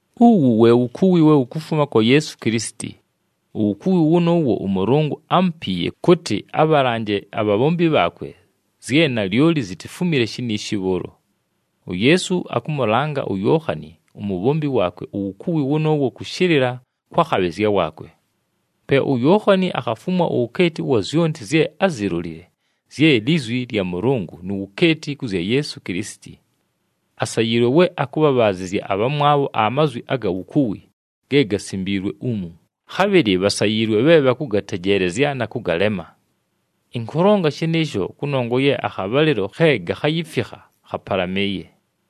Uwu we wukuwi we wukufuma kwa Yeesu Kilisiti. Uwukuwi wʉnʉʉwo ʉMʉlʉngʉ ámupiiye kʉtɨ abhalanje abhabhombi bhaakwe zye nalyoli zitifumile shiniishi bhʉʉlo. UYeesu akhamʉlanga uYookhani umubhombi waakwe uwukuwi wʉnʉʉwo kʉshɨlɨla kwa khabhɨzya waakwe. Pe uYookhani akhafumwa uwukeeti ʉwa zyonti zye ázilolile, zye lizwi lya Mʉlʉngʉ nu wukeeti kʉ zya Yeesu Kilisiti. Asayiilwe we akʉbhabhaazɨzya abhamwabho amazwi aga wukuwi ge gasimbiilwe umu, khabhɨlɨ bhasayiilwe bhe bhakʉgatejeelezya na kʉgalema. Ɨnkʉlonga shɨnɨɨsho kʉnongwa ye akhabhalɨlo khe gakhayifikha khapalamɨɨye.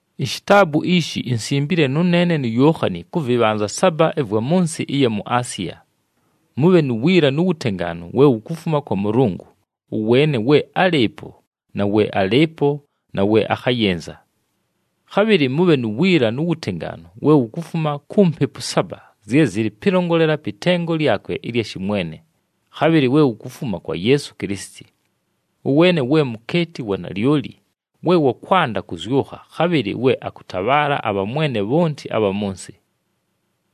Ishitaabu ishi insimbile nʉneene nu Yookhani kʉ vɨbhanza saba ɨvwa mʉ nsɨ ɨya mu Asiya. Mʉbhe nu wiila nu wutengaanu we wukufuma kwa Mʉlʉngʉ, ʉweene we álɨɨpo na we alɨɨpo na we akhayɨnza. Khabhɨlɨ mʉbhe nu wiila nu wutengaanu we wukufuma ku Mpepu saba zye zɨlɨ pɨlongolela pɨ tengo lyakwe ɨlya shɨmwene, khabhɨlɨ we wukufuma kwa Yeesu Kilisiti. Ʉweene we mukeeti wa nalyoli, we wa kwanda kʉzyʉkha, khabhɨlɨ we akʉtabhaala abhamwene bhonti abha mʉ nsɨ.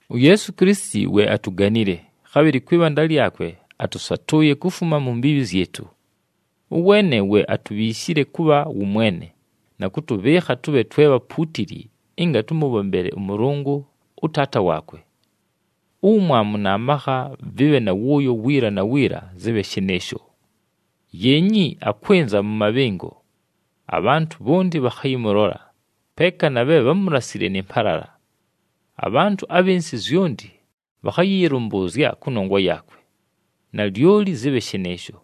UYeesu Kilisiti we atuganile, khabhɨlɨ kwɨ bhanda lyakwe atʉsatʉʉye kufuma mu mbiibhi zyɨtʉ. Ʉweene we atubhiishile kʉbha wʉmwene, na kʉtʉbhɨɨkha tʉbhe twe bhapuutili ɨnga tʉmʉbhombele ʉMʉlʉngʉ, ʉTaata waakwe. Uwumwamu na makha vɨbhe na wʉʉyo wiila na wiila! Zɨbhe shɨnɨɨsho! Yeenyi! Akwɨnza mʉ mabhɨngo! Abhantʉ bhonti bhakhayɨmʉlola, peeka na bhe bhámulasile nɨ mpalala. Abhantʉ abhɨ nsɨ zyonti bhakhayɨyɨlʉmbʉʉzya kʉnongwa yaakwe. Nalyoli! Zɨbhe shɨnɨɨsho.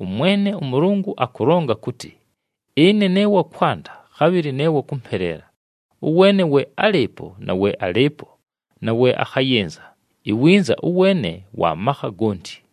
ɄMwene ʉMʉlʉngʉ akʉlonga kʉtɨ, “Ɨne ne wa kwanda, khabhɨlɨ ne wa kʉmpeleela, ʉweene we álɨɨpo na we alɨɨpo na we akhayɨnza, iwinza ʉweene Wa makha gonti.”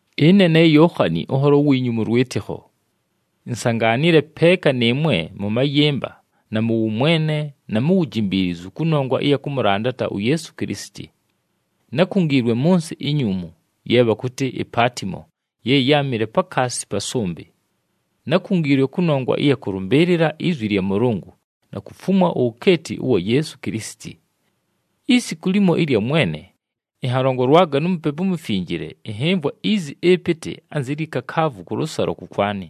Ɨne ne Yookhani, ʉnholo wiinyu mʉ lwɨtɨkho. Insangaanile peeka nɨɨmwe mʉ mayɨmba na mʉ wʉmwene na mu wujimbiilizu kʉnongwa ɨya kʉmʉlandata uYeesu Kilisiti. Nákungiilwe mʉ nsɨ inyuumu, ye bhakʉtɨ iPaatimo ye yáamɨle pakaasi pa sʉmbɨ. Nákungiilwe kʉnongwa ɨya kʉlʉmbɨɨlɨla izwi lya Mʉlʉngʉ na kufumwa uwukeeti ʉwa Yeesu Kilisiti. Isiku limo ɨlya Mwene, ɨnhalongolwaga nu Mupepu uMufinjile, ɨnhɨmvwa izi ɨpɨtɨ anzi lyi kakaavu kʉlʉsalo kʉkwanɨ.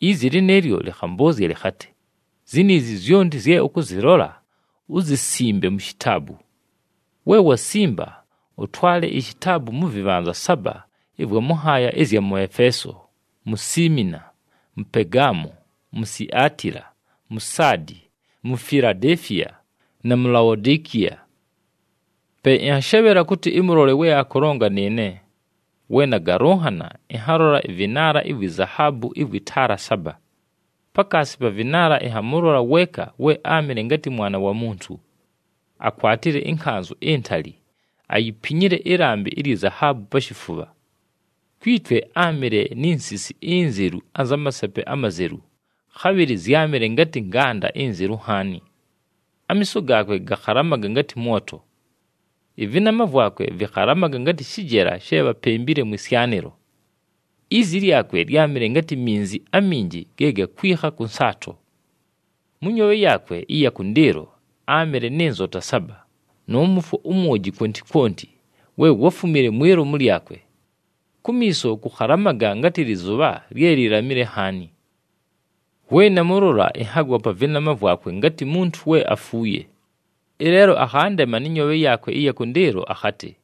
Izi lɨnɨɨlyo lɨkhambʉʉzya lɨkhatɨ, “Ziniizi zyonti zye ʉkʉzɨlola, uzisimbe mu shitaabu. We wasimba, ʉtwale ishitaabu mʉ vɨbhanza saba ɨvwa mʉ nhaaya ɨzya mʉ Efeeso, mu Siimina, mʉ Pegaamo, mu Siatila, mu Saadi, mu Filadeefiya na mu Laodikiya.” Pe ɨnhashebhela kʉtɨ ɨmʉlole we akʉlonga nɨɨne. We nagalʉnhana, ɨnhalola ɨvɨnaala ivwi zahaabu ɨvwɨ taala saba. Pakaasi pa vɨnaala ɨnhamʉlola weeka we áamɨle ngatɨ Mwana wa Muntu. Akwatile ɨnkanzʉ intali, ayipinyile ɨlambɨ ilyi zahaabu pa shifubha. Kwi twe áamɨle ni nsisi inzelu anza masepe amazelu, khabhɨlɨ zyámɨle ngatɨ nganda inzelu nhaani. Amiiso gaakwe gakhalamaga ngatɨ mwoto. Ɨvɨnama vwakwe vɨkhalamaga ngatɨ shɨjela she bhapembile mwɨ syanɨlo. Izi lyakwe lyámɨle ngatɨ minzi aminji ge gakwikha kʉ nsaato. Mʉ nyoobhe yaakwe ɨya kʉndɨɨlo áamɨle nɨ nzota saba, nʉ mʉfwo umwoji kwonti kwonti we wáfumile mwi lomu lyakwe. Kumiiso kʉkhalamaga ngatɨ lɨzʉbha lye lilamile nhaani. We namʉlola, ɨnhagwa pa vɨnama vwakwe ngatɨ muntu we afuuye. Ɨleelo akhandema nɨ nyoobhe yaakwe ɨya kʉndɨɨlo akhatɨ,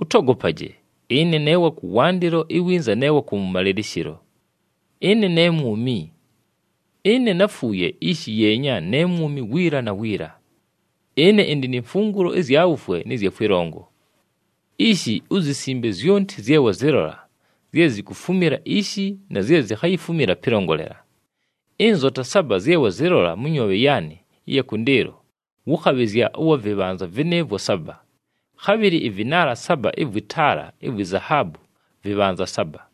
“Ʉtogopaje! Ɨne ne wa kʉwandɨlo iwinza ne wa kʉwʉmalɨlɨshɨlo. Ɨne ne Mwumi. Ɨne náfuuye, ishi yeenya ne mwumi wiila na wiila! Ɨne ɨndɨ ni mfungulo ɨzya wufwe nɨ zya kwɨlongo. “Ishi, uzisimbe zyonti zye wazɨlola, zye zikufumila ishi na zye zikhayifumila pɨlongolela. Ɨnzota saba zye wazɨlola mʉ nyoobhe yaanɨ ɨya kʉndɨɨlo, wʉ khabhɨzya ʉwa vɨbhanza vɨnɨɨvwo saba, khabhɨlɨ ɨvɨnaala saba ɨvwɨ taala ivwi zahaabu vɨbhanza saba.”